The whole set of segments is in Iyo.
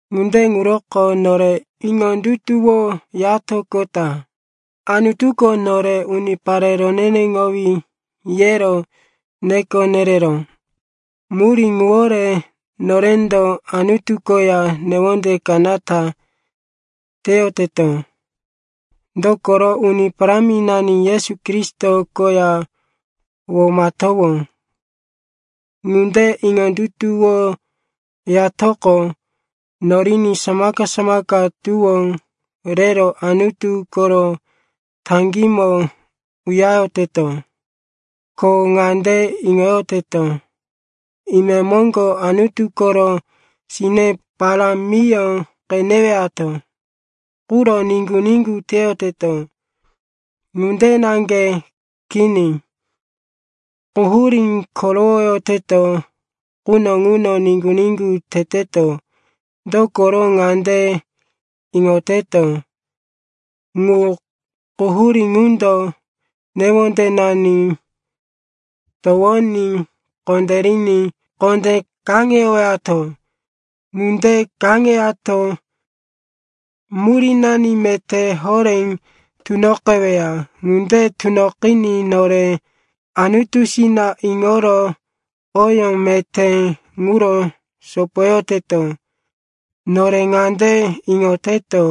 Ŋunde ŋuroko nore iŋondutuwoyatoqota Anutuko nore, unipare roneneŋowí, yero neko nereró. Murí ŋuwore norendo Anutu koya newonde kanata teyoteto, dokoro Uni Paráminani Yesu Kristo koya womatowó. Ŋunde iŋondutuwoyatoqo, noriní samaka-samaka tuwó rero Anutu koro taŋgímo uyareyoteto. Ko ŋande iŋoyoteto, imemoŋgo Anutu koro sine parámiyó qenewato quro niŋgu-niŋgu teyoteto. Ŋunde naŋge kini. Quhurí korowoyoteto quno ŋuno niŋgu-niŋgu teteto, dokoro ŋande iŋoteto, ŋu quhurí ŋundo newondenani towoní kondériní kondé kaŋeyowato. Ŋunde kaŋeyato murínani meté horé tunoqeweya. Ŋunde tunoqiní nore Anutusina iŋoro oyó meté ŋuro sopoyoteto. Nore ŋande iŋoteto,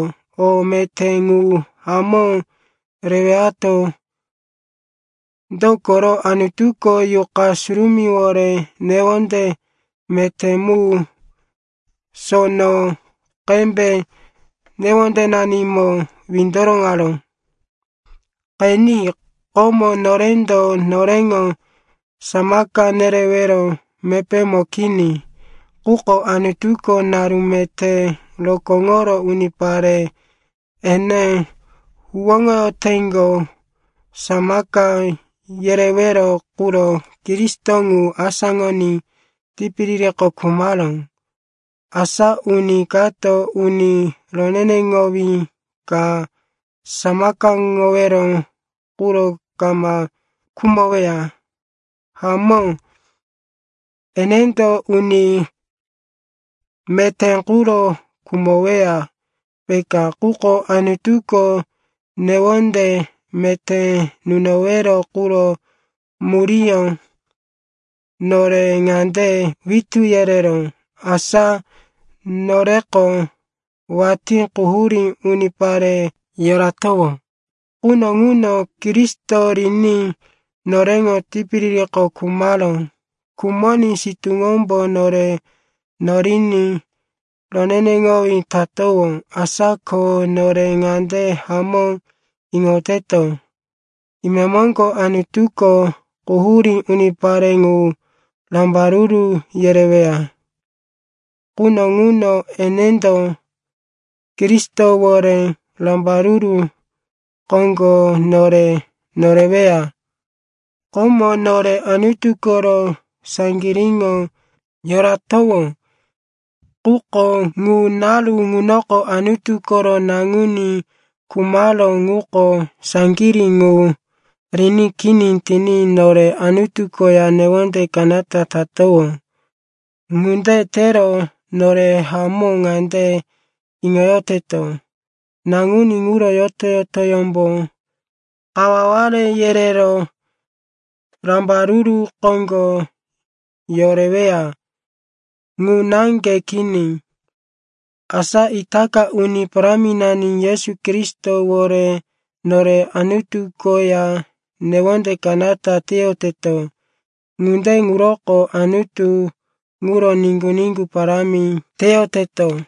o meté ŋu hamó rewato, dokoro Anutuko Yuqa Surumíwore newonde meté mu sono qembe newondenanimo windoroŋaró. Qeni. Komo, norendo noreŋo samaka nerewero mepémo kini. Quko Anutuko naru meté rokóŋoro unipare ene huwóŋoyoteŋgo samaka yerewero quro Kristo ŋu asáŋoní tipiririko khumaró. Asa uni kato uni roneneŋowí ka samakaŋowero quro kama khumoweya. Hamó, enendo uni meté quro khumoweya, peka. Quko Anutuko newonde meté nunowero quro muríyó nore ŋande witú yereró, asa noreko watí quhurí unipare yoratowó quno ŋuno Kristo riní noreŋo tipiririko khumaró. Khumoní sitúŋombo nore noriní roneneŋowí tatowó. Asa ko nore ŋande hamó iŋoteto, imemoŋgo Anutuko quhurí unipare ŋu rambaruru yereweya quno ŋuno enendo Kristowore rambaruru koŋgo nore noreweya. Komo nore Anutu koro saŋgiríŋo yoratowó. Quko ŋu naru ŋunoko Anutu koro Naŋuní khumaró ŋuko saŋgirí ŋu riní kini tiní nore Anutu koya newonde kanata tatowó. Ŋunde tero nore hamó ŋande iŋoyoteto, Naŋuní ŋuro yoto-yotoyómbo kawaware yerero rambaruru koŋgo yoreweya. Ŋu naŋge kini, asa itaka Uni Paráminani Yesu Kristowore nore Anutu koya newonde kanata teyoteto. Ŋunde ŋuroko Anutu ŋuro niŋgu-niŋgu parámi teyoteto.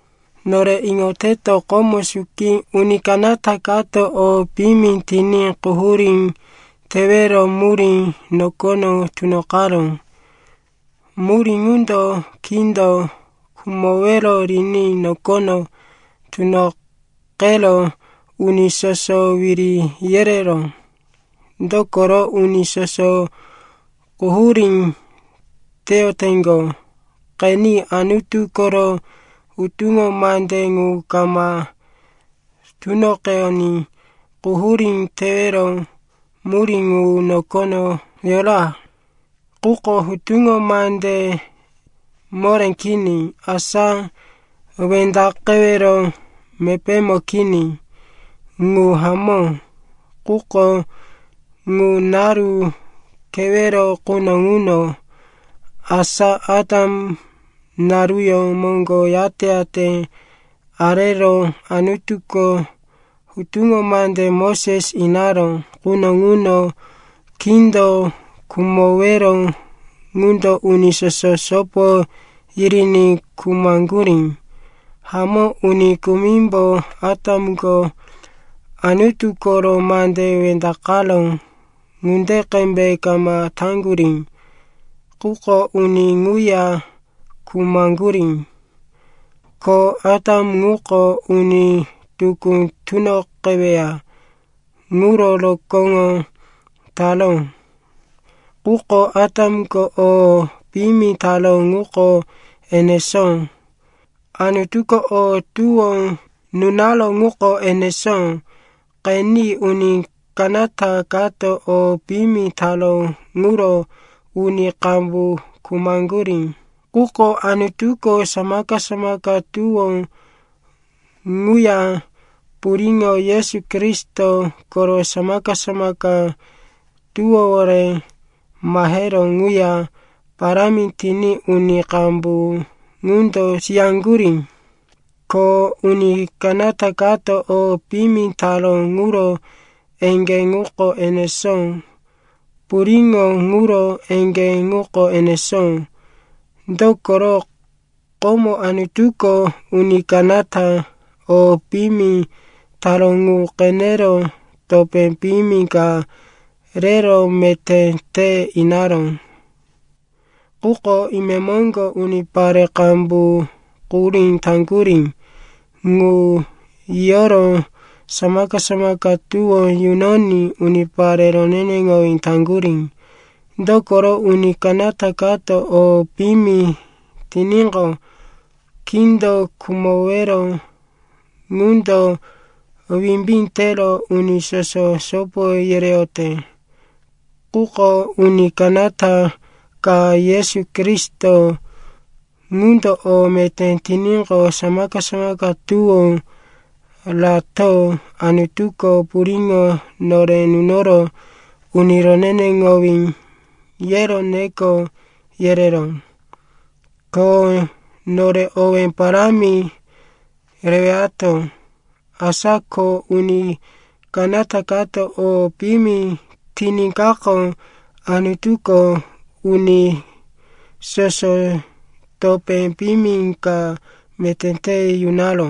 Nore iŋoteto, komo suki uni kanata kato o piyimi tiní quhurí tewero murí nokono tunoqaró. Murí ŋundo kindo khumowero riní nokono tunoqero uni soso wiri yereró, dokoro uni soso quhurí teyoteŋgo. Qeni, Anutu koro hutuŋo mande ŋu kama tunoqeyoní quhurí tewero murí ŋu nokono yora. Quko hutuŋo mande moré kini, asa wendaqewero mepémo kini. Ŋu hamó, quko ŋu naru kewero quno ŋuno, asa Atam naruyó moŋgo yate-yate arero Anutuko hutuŋo mande Moses inaró quno ŋuno, kindo khumowero ŋundo uni soso sopo yiriní khumaŋgurí. Hamó, uni kumimbo Atamko Anutu koro mande wendaqaró ŋunde qembe kama taŋgurí. Quko uni ŋuya khumaŋgurí. Ko Atam ŋuko uni tukú tunoqeweya ŋuro rokóŋo taró. Quko Atamko o piyimi taró ŋuko enesó, Anutuko o tuwó nunaró ŋuko enesó. Qeni, uni kanata kato o piyimi taró ŋuro uni qambu khumaŋgurí. Quko Anutuko samaka-samaka tuwó ŋuya puriŋo Yesu Kristo koro samaka-samaka tuwówore maheró ŋuya parámi tiní uni qambu ŋundo siyaŋgurí. Ko uni kanata kato o piyimi taró ŋuro eŋgé ŋuko enesó, puriŋo ŋuro eŋgé ŋuko enesó. Dokoro komo Anutuko uni kanata o piyimi taró ŋu qenero topé piyimi ka rero meté te inaró. Quko imemoŋgo unipare qambu quhurí taŋgurí ŋu yiyoro samaka-samaka tuwó yunoní unipare roneneŋowí taŋgurí. Dokoro uni kanata kato o piyimi tiníqo, kindo khumowero ŋundo wimbí tero uni soso sopo yereyote. Quko uni kanata ka, Yesu Kristo, ŋundo o meté tiníqo, samaka-samaka tuwó rato Anutuko puriŋo nore nunoro, uni roneneŋowí, yero neko yereró. Ko nore owé parámi rewato. Asa ko uni kanata kato o piyimi tiníkaqo, Anutuko uni soso topé piyimi ka meté te yunaró.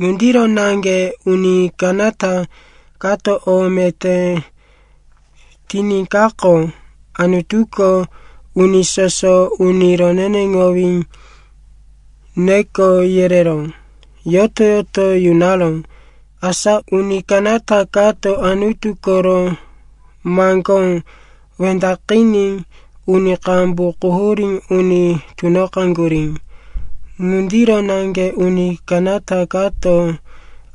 Ŋundiro naŋge uni kanata kato o meté tiníkaqo, Anutuko uni soso, uni roneneŋowí, neko yerero yoto-yoto yunaró. Asa uni kanata kato Anutu koro maŋgó wendaqiní uni qambu quhurí uni tunoqaŋgurí. Ŋundiro naŋge uni kanata kato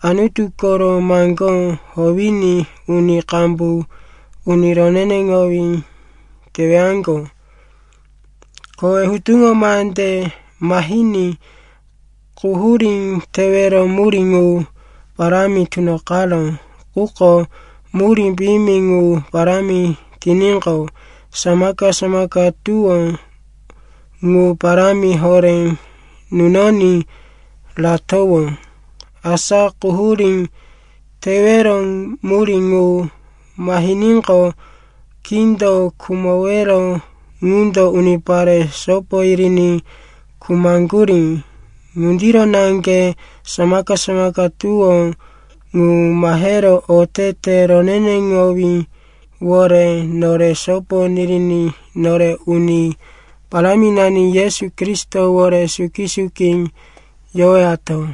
Anutu koro maŋgó howiní uni qambu uni roneneŋowí tewaŋgo. Kowe hutuŋo mande mahiní quhurí tewero murí ŋu parámi tunoqaró. Quko murí piyimi ŋu parámi tiníqo, samaka-samaka tuwó ŋu parámi horé nunoní ratowó. Asa quhurí tewero murí ŋu mahiníqo, kindo khumowero ŋundo unipare sopo yiriní khumaŋgurí. Ŋundiro naŋge samaka-samaka tuwó ŋu mahero otete roneneŋowíwore nore sopo niriní nore Uni Paráminani Yesu Kristowore suki-suki yowato.